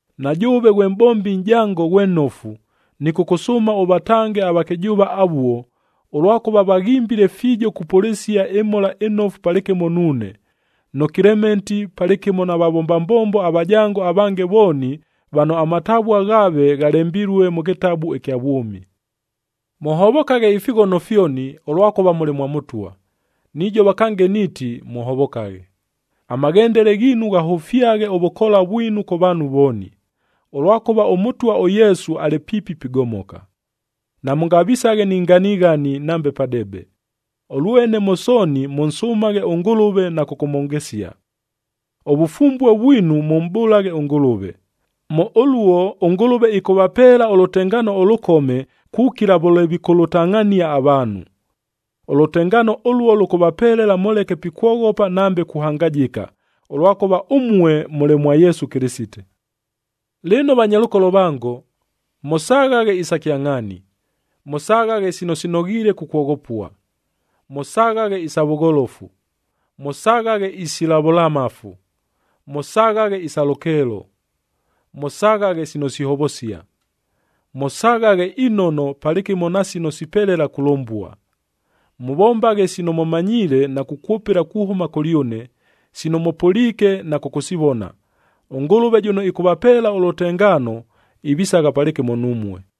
Na jʉʉve ghwe mʼbombi nʼjango ghwe nnofu, nɨkʉkʉsʉʉma ʉvatange avakɨjʉʉva avuo, ʉlwakʉva vaghimbile fiijo kupʉlɨsia ɨMhola ɨNofu palɨkɨmo nuune, nʉ Kelementi palɨkɨmo na vavomba mbombo avajango avange vooni vano amatavua ghaave, ghalembilue mʉ kɨtabu ɨkya vwʉmi. Mʉhovokaghe ifighono fyoni, ʉlwakʉva mʉlɨ mwa Mʉtwa. Nijova kange niiti, mʉhovokaghe! Amaghendele ghiinu ghahʉfyaghe ʉvʉkoola vwinu kʉ vaanhu vooni, ʉlwakʉva ʉMʉtwa ʉYesu alɨ piipi pigomoka. Namʉngavisaghe ni nganighani nambe padebe. Ʉlwene mʉ sooni mʉnsʉmaghe ʉNgʉlʉve na kʉkʉmhongesia. Ʉvʉfumbue vwinu mʉmʼbʉlaghe ʉNgʉlʉve. Mʉ ʉluo ʉNgʉlʉve ɨkʉvapeela ʉlʉtengaano ʉlʉkome kukila vʉle vikʉlʉtangʼhania avaanhu. Ʉlʉtengaano ʉluo lʉkʉvapelela mʉleke pikwoghopa nambe kuhangajɨka, ʉlwakʉva ʉmue mʉlɨ mwa Yesu Kɨlɨsite. Lɨno vanyalʉkolo vango, mʉsaghaghe isa kyangʼhaani, mʉsaghaghe sino sinoghiile kukwoghopua, mʉsaghaghe isa vʉgholofu, mʉsaghaghe isila vʉlamafu, mʉsaghaghe isa lʉkeelo, mʉsaghaghe sino sihovosia, mʉsaghaghe inono palɨkɨmo na sino sipelela kulʉmbua. Mʉvombaghe sino mʉmanyiile na kukwʉpɨla kuhʉma kʉlyʉne, sino mʉpʉliike na kʉkʉsivona. ɄNgʉlʉve jʉno ɨkʉvapeela ʉlʉtengaano, ivisagha palɨkɨmo numue.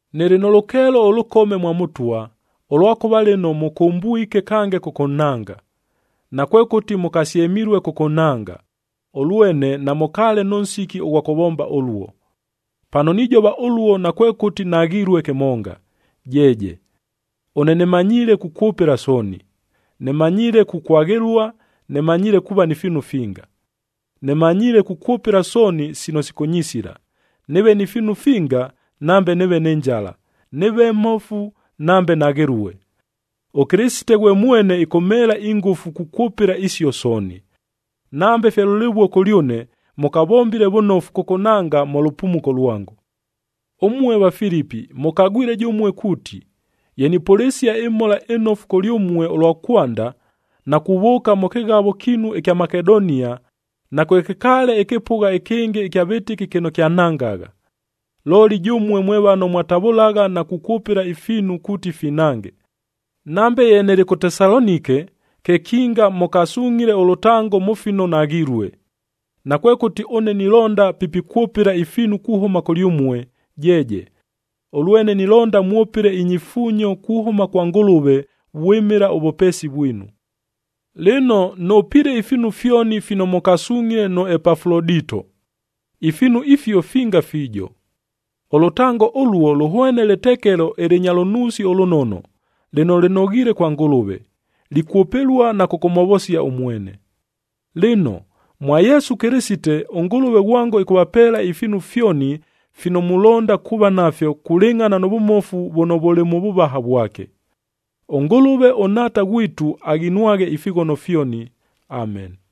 Nɨlɨ nʉ lʉkeelo ʉlʉkome mwa Mʉtwa, ʉlwakʉva lɨno mʉkʉmbwike kange kʉkʉnhanga. Nakwekʉti mʉkasyemilue kʉkʉnhanga, ʉlwene namʉkaale nʉ nsiki ʉghwa kʉvomba ʉluo. Pano nijova ʉluo nakwekʉti naghilue kɨmonga, jeeje! Ʉne nɨmanyiile kukwʉpɨla sooni. Nɨmanyiile kukwaghɨlua, nɨmanyiile kuuva ni fiinu finga. Nɨmanyiile kukwʉpɨla sooni sino sikʉnyisila, nɨɨve ni fiinu finga nambe nɨɨve nɨ njala; nɨɨve mmofu nambe naghɨlue. ɄKɨlɨsite ghwe mwene ɨkʉmheela ingʉfu kukwʉpɨla isio sooni. Nambe fye lʉlɨvuo kʉlyʉne, mʉkavombile vʉnofu kʉkʉnhanga mʉ lʉpumuko lwango. Ʉmue Vafilipi mʉkagwile jʉmue kuuti, ye nipʉlɨsia ɨMhola ɨNofu kʉlyʉmue ʉlwa kwanda, na kuvʉʉka mʉ kɨghavoa kiinu ɨkya Makedonia, nakwekɨkaale ɨkɨpʉgha ɨkɨngɨ ɨkya vɨtɨki kɨno kyanhangagha. Looli jʉmue mwe vano mwatavʉlagha na kukwʉpɨla ifiinu kuuti finhange. Nambe ye nɨlɨ kʉ Tesalonike, kekinga mʉkasungʼhile ʉlʉtango mʉ fino naghilue. Nakwekʉti ʉne nilonda pi pikwʉpɨla ifiinu kuhʉma kʉlyʉmue, jeeje! Ʉlwene nilonda mwʉpɨle inyifuunyo kuhʉma kwa Ngʉlʉve vwɨmɨla ʉvʉpeesi vwinu. Lɨno, nʉpiile ifiinu fyoni fino mʉkasungʼhile nʉ Epafulodito. Ifiinu ifio finga fiijo. Ʉlʉtango ʉluo lʉhwene lɨtekelo ɨlɨnya lʉnuusi ʉlʉnono, lɨno lɨnoghiile kwa Ngʉlʉve, likwʉpɨlua na kʉkʉmhovosia ʉmwene. Lɨno, mwa Yesu Kɨlɨsite, ʉNgʉlʉve ghwango ɨkʉvapeela ifiinu fyoni fino mulonda kuuva nafyo kulɨngʼhana nʉ vʉmofu vʉno vʉlɨ mʉ vʉvaha vwake. ɄNgʉlʉve ʉNhaata ghwitu aghinwaghe ifighono fyoni. Ameni.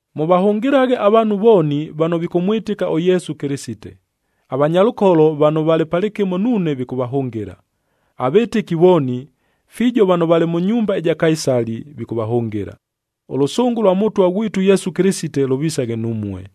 Mʉvahʉngɨlaghe avaanhu vooni vano vikʉmwɨtɨka ʉYesu Kɨlɨsite. Avanyalʉkolo vano valɨ palɨkɨmo nuune vikʉvahʉngɨla. Avɨtɨki vooni, fiijo vano valɨ mʉ nyumba ɨja Kaisali,b vikʉvahʉngɨla. Ʉlʉsʉngʉ ʉlwa Mʉtwa ghwitu ʉYesu Kɨlɨsite lʉvisaghe numue.